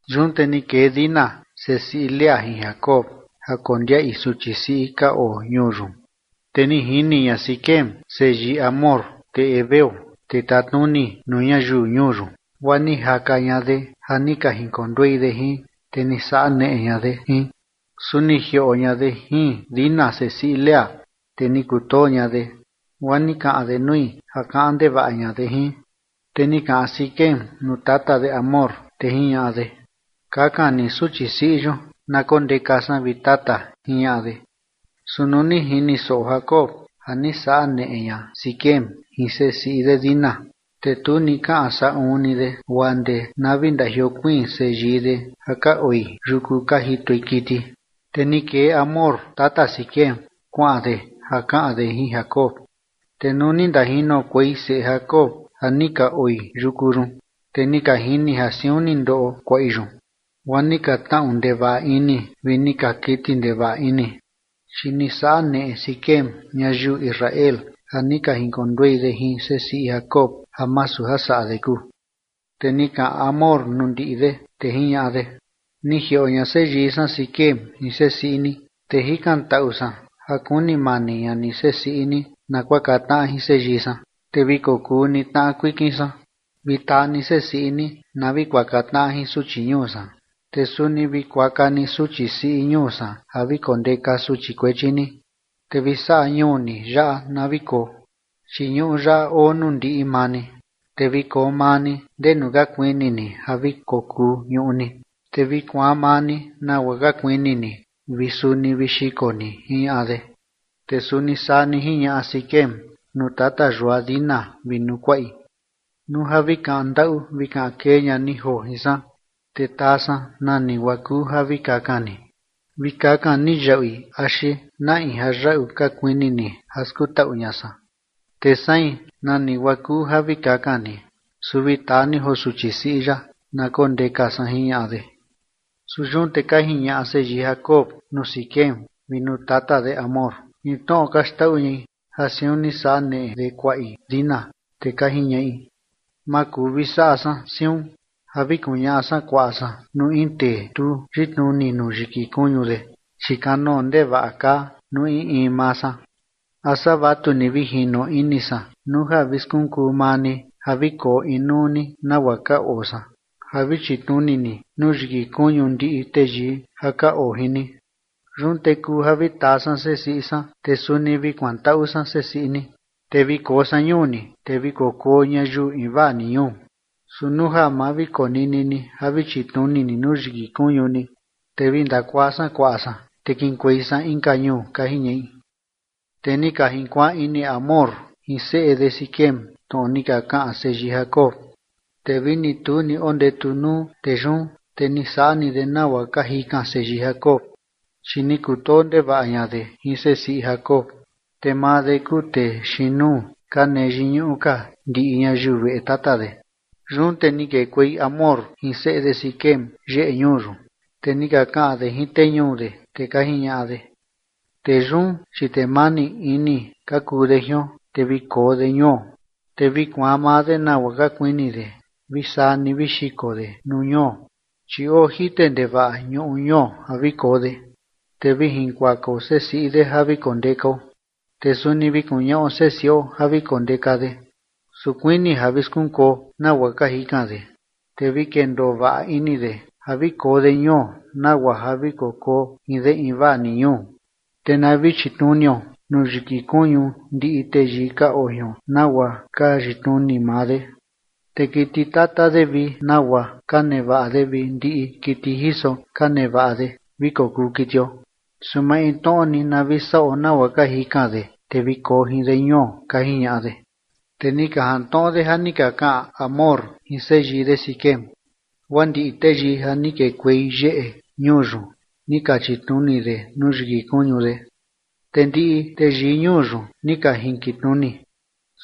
Yun te ni kee Dina sesiꞌi Lea jin Jacob ja kondiaꞌi suchi siꞌi ka oo ñuu yun. Te ni jini ña Siquem seyii Hamor, tee heveo, tee tatnuni nuu ñayiu ñuu yun, guaa ni jaka ña de ja ni ka jinkonduei de jin, te ni saꞌa neꞌe ña de jin. Su ni jioꞌo ña de jin Dina, sesiꞌi Lea, te ni kutoo ña de, guaa ni kaꞌan de nui ja kaꞌan ndevaꞌa ña de jin. Te ni kaꞌan Siquem nuu tata de Hamor, te jiñaꞌa de: ―Kakan ni suchi siꞌi yun na kondeka san, vi tata ―jiñaꞌa de. Su nuu ni jini soꞌo Jacob ja ni saꞌa neꞌe ña Siquem jin sesiꞌi de Dina, te tu ni kaꞌan saꞌun ni de guaa ndee na vi ndajiokuiin seyii de ja ka oi yuku ka jitoi kiti. Te ni kee Hamor tata Siquem kuaꞌan de ja kaꞌan de jin Jacob. Te nuu ni ndajinokuei seꞌe Jacob ja ni ka oi yuku yun, te ni ka jini ja siun ni ndoꞌo kuaꞌi yun, guaa ni ka tnaꞌu ndevaꞌa ini vi ni ka kiti ndevaꞌa ini, chi ni saꞌa neꞌe Siquem ñayiu Israel ja ni ka jinkonduei de jin sesiꞌi Jacob, ja masu ja saꞌa de kuu. Te ni kaꞌan Hamor nuu ndiꞌi de, te jiñaꞌa de: ―Ni jioꞌo ña seyii san Siquem jin sesiꞌi ni, te jikantaꞌu san ja kuni mani ña ni sesiꞌi ni na kuaka tnaꞌa jin seyii san. Te vi kokuu ni tnaꞌa kuikin san, vi taa ni sesiꞌi ni na vi kuaka tnaꞌa jin suchi ñuu san, te suni vi kuaka ni suchi siꞌi ñuu san ja vi kondeka suchi kuechi ni. Te vi saꞌa ñuu ni yaꞌa na vi koo, chi ñuꞌu yaꞌa oo nuu ndiꞌi maa ni, te vi koo maa ni ndenu ka kuini ni ja vi kokuu ñuꞌu ni, te vi kuaan maa ni nagua ka kuini ni vi suni vi xiko ni ―jiñaꞌa de. Te suni saa ni jiñaꞌa Siquem nuu tata yua Dina vi nuu kuaꞌi: ―Nuu ja vi kaꞌan ndaꞌu vi kaꞌan kee ña ni joo jin san, te taa san nani guaa kuu ja vi kakan ni. Vi kakan ni yaꞌui axi na in ja yaꞌu ka kuini ni ja skutaꞌu ña san, te sein, nani guaa kuu ja vi kakan ni, su vi taa ni joo suchi siꞌi yaꞌa na kondeka san ―jiñaꞌa de. Su yun te ka jiñaꞌa seyii Jacob nuu Siquem vi nuu tata de Hamor jin tnoꞌo ka xndaꞌu ñai ja siun ni saꞌa neꞌe de kuaꞌi Dina. Te ka jiñaꞌi: ―Ma kuu vi saꞌa san siun ja vi kuñaꞌa san kuaꞌa san nuu in tee tu yitnuni nuu yiki kuñu de, chi kanoo ndevaꞌa kaa nuu in in maa san. A saa vatu ni vi jino ini san nuu ja vi skunkuu maa ni ja vi koo inuu ni nagua ka oo san ja vi chitnuni ni nuu yiki kuñu ndiꞌi teyii ja ka oo jin ni. Yun te kuu ja vi taa san sesiꞌi san, te suni vi kuantaꞌu san sesiꞌi ni, te vi koo san ñuu ni, te vi kokuo ñayiu invaa ni ñuu. Su nuu ja ma vi konini ni ja vi chitnuni ni nuu yiki kuñu ni, te vi ndakuaa san kuaꞌa san, te kiꞌinkuei san inka ñuu ―ka jiñaꞌi. Te ni ka jinkuaan ini Hamor jin seꞌe de Siquem tnoꞌo ni ka kaꞌan seyii Jacob. Te vini tu ni ondetu nuu tee yun, te ni saꞌa ni de nagua ka jikan seyii Jacob, chi ni kutoo ndevaꞌa ña de jin sesiꞌi Jacob, te maa de kuu tee xiin nuu ka nee yiñuꞌu ka ndiꞌi ñayiu veꞌe tata de. Yun te ni kekuei Hamor jin seꞌe de Siquem yeꞌe ñuu yun, te ni ka kaꞌan de jin tee ñuu de, te ka jiñaꞌa de: ―Tee yun, chi tee mani ini ka kuu de jion, te vi koo de ñuo, te vi kuaan maa de nagua ka kuini de vi saa ni vi xiko de nuu ñuo, chi oo jite ndevaꞌa ñuꞌu ñuo ja vi koo de, te vi jinkuakao sesiꞌi de ja vi kondekao, te suni vi kuñaꞌo sesiꞌo ja vi kondeka de. Su kuini ja vi skunkuo nagua ka jikan de, te vi kendoo vaꞌa ini de ja vi koo de ñuo nagua ja vi kokuo jin de invaa ni ñuu. Te na vi chitnunio nuu yiki kuñu ndiꞌi teyii ka oo jion nagua ka yitnuni maa de. Te kiti tata de vi nagua ka nevaꞌa de vi ndiꞌi kiti jiso ka nevaꞌa de vi kokuu kitio, su maintnoꞌo ni na vi saꞌo nagua ka jikan de, te vi koo jin de ñuo ―ka jiñaꞌa de. Te ni ka jantnoꞌo de ja ni ka kaꞌan Hamor jin seyii de Siquem, guaa ndiꞌi teyii ja ni kekuei yeꞌe ñuu yun ni ka chitnuni de nuu yiki kuñu de, te ndiꞌi teyii ñuu yun ni ka jinkitnuni.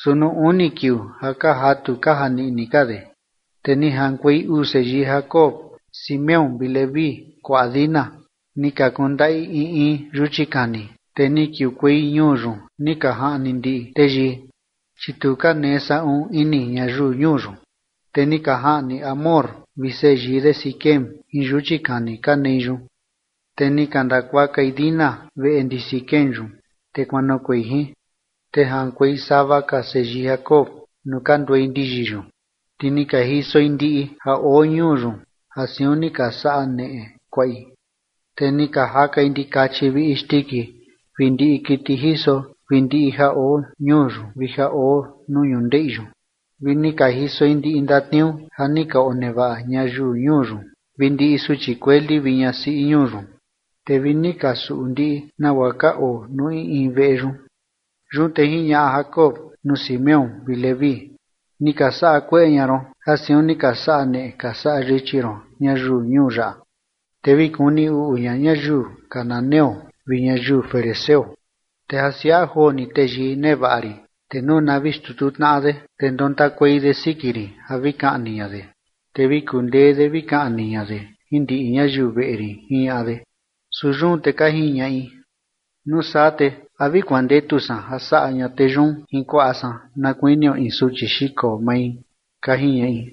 Su nuu uni kiuu ja kaa jatu kaa janiꞌni ka de, te ni jaꞌankuei uu seyii Jacob, Simeón vi Leví, kuaꞌa Dina, ni ka kundaꞌi in in yuchi kani, te ni kiukuei ñuu yun ni ka jaꞌni ndiꞌi teyii, chi tu ka nee saꞌun ini ñayiu ñuu yun. Te ni ka jaꞌni Hamor vi seyii de Siquem jin yuchi kani ka nei yun, te ni ka ndakuakai Dina veꞌe ndi Siquem yun, te kuanoꞌokuei jin. Te jaꞌankuei sava ka seyii Jacob nuu ka nduei ndiyi yun, te ni ka jisoi ndiꞌi ja oo ñuu yun ja siun ni ka saꞌa neꞌe kuaꞌi. Te ni ka jakai ndikachi vi isndiki vi ndiꞌi kiti jiso vi ndiꞌi ja oo ñuu yun vi ja oo nuu ñundeꞌi yun. Vi ni ka jisoi ndiꞌi ndatniuu ja ni ka onevaꞌa ñayiu ñuu yun vi ndiꞌi suchi kueli vi ñasiꞌi ñuu yun, te vi ni ka suꞌu ndiꞌi nagua ka oo nuu in in veꞌe yun. Yun te jiñaꞌa Jacob nuu Simeón vi Leví: ―Ni ka saꞌa kueꞌe ña ron ja siun ni ka saꞌa neꞌe ka saꞌa yichi ron ñayiu ñuu yaꞌa. Te vi kuni uꞌu ña ñayiu cananeo vi ñayiu ferezeo, te ja siaꞌa joo ni teyii nevaꞌa rin, te nuu na vi xtutu tnaꞌa de, te ndontakuei de siki rin ja vi kaꞌni ña de, te vi kundee de vi kaꞌni ña de jin ndiꞌi ñayiu veꞌe rin ―jiñaꞌa de. Su yun te ka jiñaꞌi: ―Nuu saa, ¿te a vi kuandetu san ja saꞌa ña tee yun jin kuaꞌa san na kuinio in suchi xiko mai? ―ka jiñaꞌi.